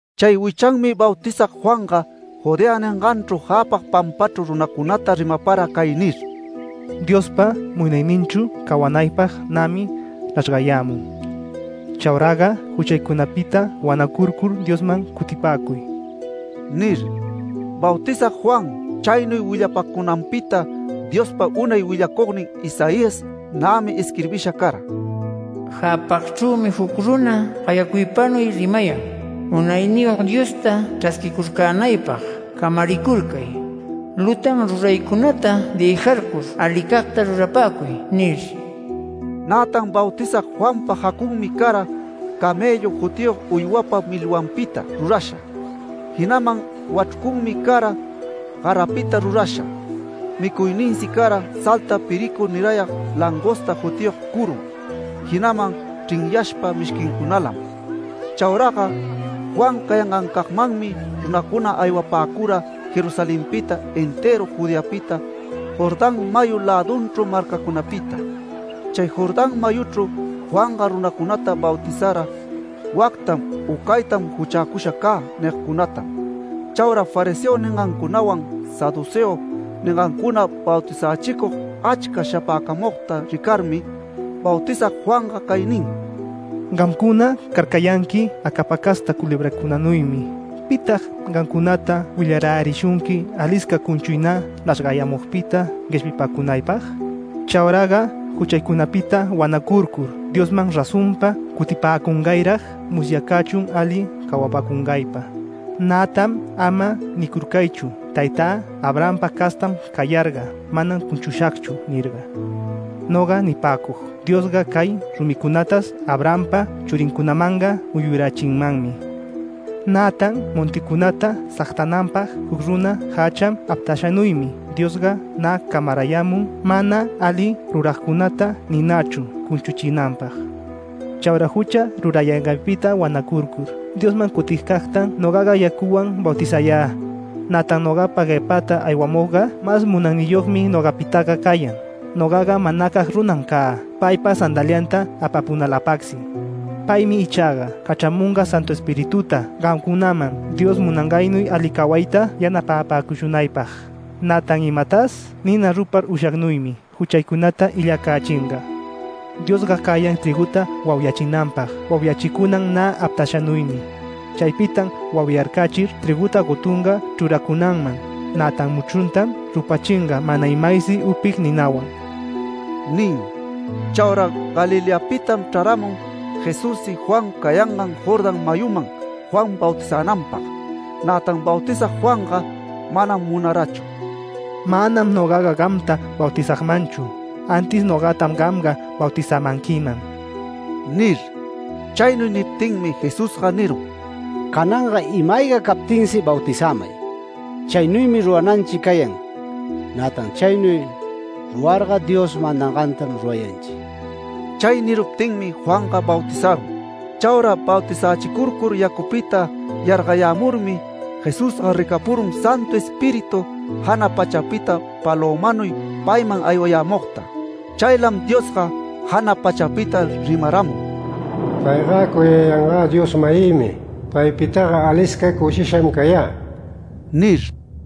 Chay wichanmi Bautizag Juanga Judea ninganchru jäpag pampachru runacunata rimapara cay nir: “Diospa munayninchru cawanaypag nämi nachrgayämun. Chauraga juchaycunapita wanacurcur Diosman cutipäcuy” nir. Bautizag Juan chaynuy willapacunanpita Diospa unay willacugnin Isaías nämi isquirbisha cara: “Jäpagchrümi juc runa gayacuypanuy rimayan: ‘Munayniyog Diosta chrasquicurcänaypag camaricurcay. Lutan ruraycunata dëjarcur alicagta rurapäcuy’ nir”. Nätan Bautizag Juanpa jacunmi cara ‘camellu’ jutiyog uywapa milwanpita rurasha. Jinaman wachrucunmi cara garapita rurasha, micuyninsi cara salta piricu nirayag langosta jutiyog curum, jinaman chrinyashpa mishquincunalam. Chauraga Juan cayangancagmanmi runacuna aywapäcura Jerusalenpita, entëru Judeapita, Jordán mayu lädunchru marcacunapita. Chay Jordán mayuchru Juanga runacunata bautizara “Wactam u caytam juchäcusha cä” nigcunatam. Chaura fariseo ningancunawan saduceo ningancuna bautizächicug achca shapäcamugta ricarmi, Bautizag Juanga cay nin: “¡Gamcuna carcayanqui acapa casta culebracunanuymi! ¿Pitag gamcunata willarärishunqui alisca cunchuy nä nachrgayämugpita gueshpipäcunaypag? Chauraga juchaycunapita wanacurcur Diosman razonpa cutipäcungayrag musyacächun ali cawapäcungaypa. Nätan ama nicurcaychu: ‘Taytä Abrahampa castan cayarga manam cunchushagchu’ nirga. Noga nipäcug: Diosga cay rumicunatas Abrahampa churincunamanga muyurachinmanmi. Nätan monticunata sagtananpag juc runa jächan aptashanuymi Diosga nä camarayämun mana ali ruragcunata ninachru cunchuchinanpag. Chaura jucha rurayanganpita wanacurcur Diosman cutigcagtam nogaga yacuwan bautizayä. Nätan nogapa guepäta aywayämugga mas munayniyogmi nogapitaga cayan. Nogaga manacag runam cä paypa sandalianta apapunaläpagsi. Paymi ichaga cachramunga Santu Espirituta gamcunaman Dios munangannuy ali cawayta yanapapäcushunaypag, nätan imatas nina rupar ushagnuymi juchaycunata illacächinga. Diosga cayan trïguta wauyachinanpag wauyachicunan nä aptashanuymi. Chaypitam wauyarcachir trïguta gotunga chruracunanman. Nätan muchruntam rupachinga mana imaysi upig ninawan” nin. Chaura Galileapitam chraramun Jesussi Juan cayangan Jordán mayuman Juan bautizänanpag. Nätan Bautizag Juanga manam munarachu, “Manam nogaga gamta bautizagmanchu, antis nogatam gamga bautizämanquiman” nir. Chaynuy niptinmi Jesusga nirun: “Cananga ima-ayga captinsi bautizämay. Chaynuymi rurananchi cayan. Nätan chaynuy rurarga Dios mandangantam rurayanchi”. Chay niruptinmi Juanga bautizarun. Chaura bautizächicurcur yacupita yargayämurmi, Jesusga ricapurun Santu Espíritu jana pachapita palömanuy payman aywayämugta. Chaylam Diosga jana pachapita rimaramun: “Payga cuyayangä Dios-mayïmi. Paypitaga alisca cushisham cayä” nir.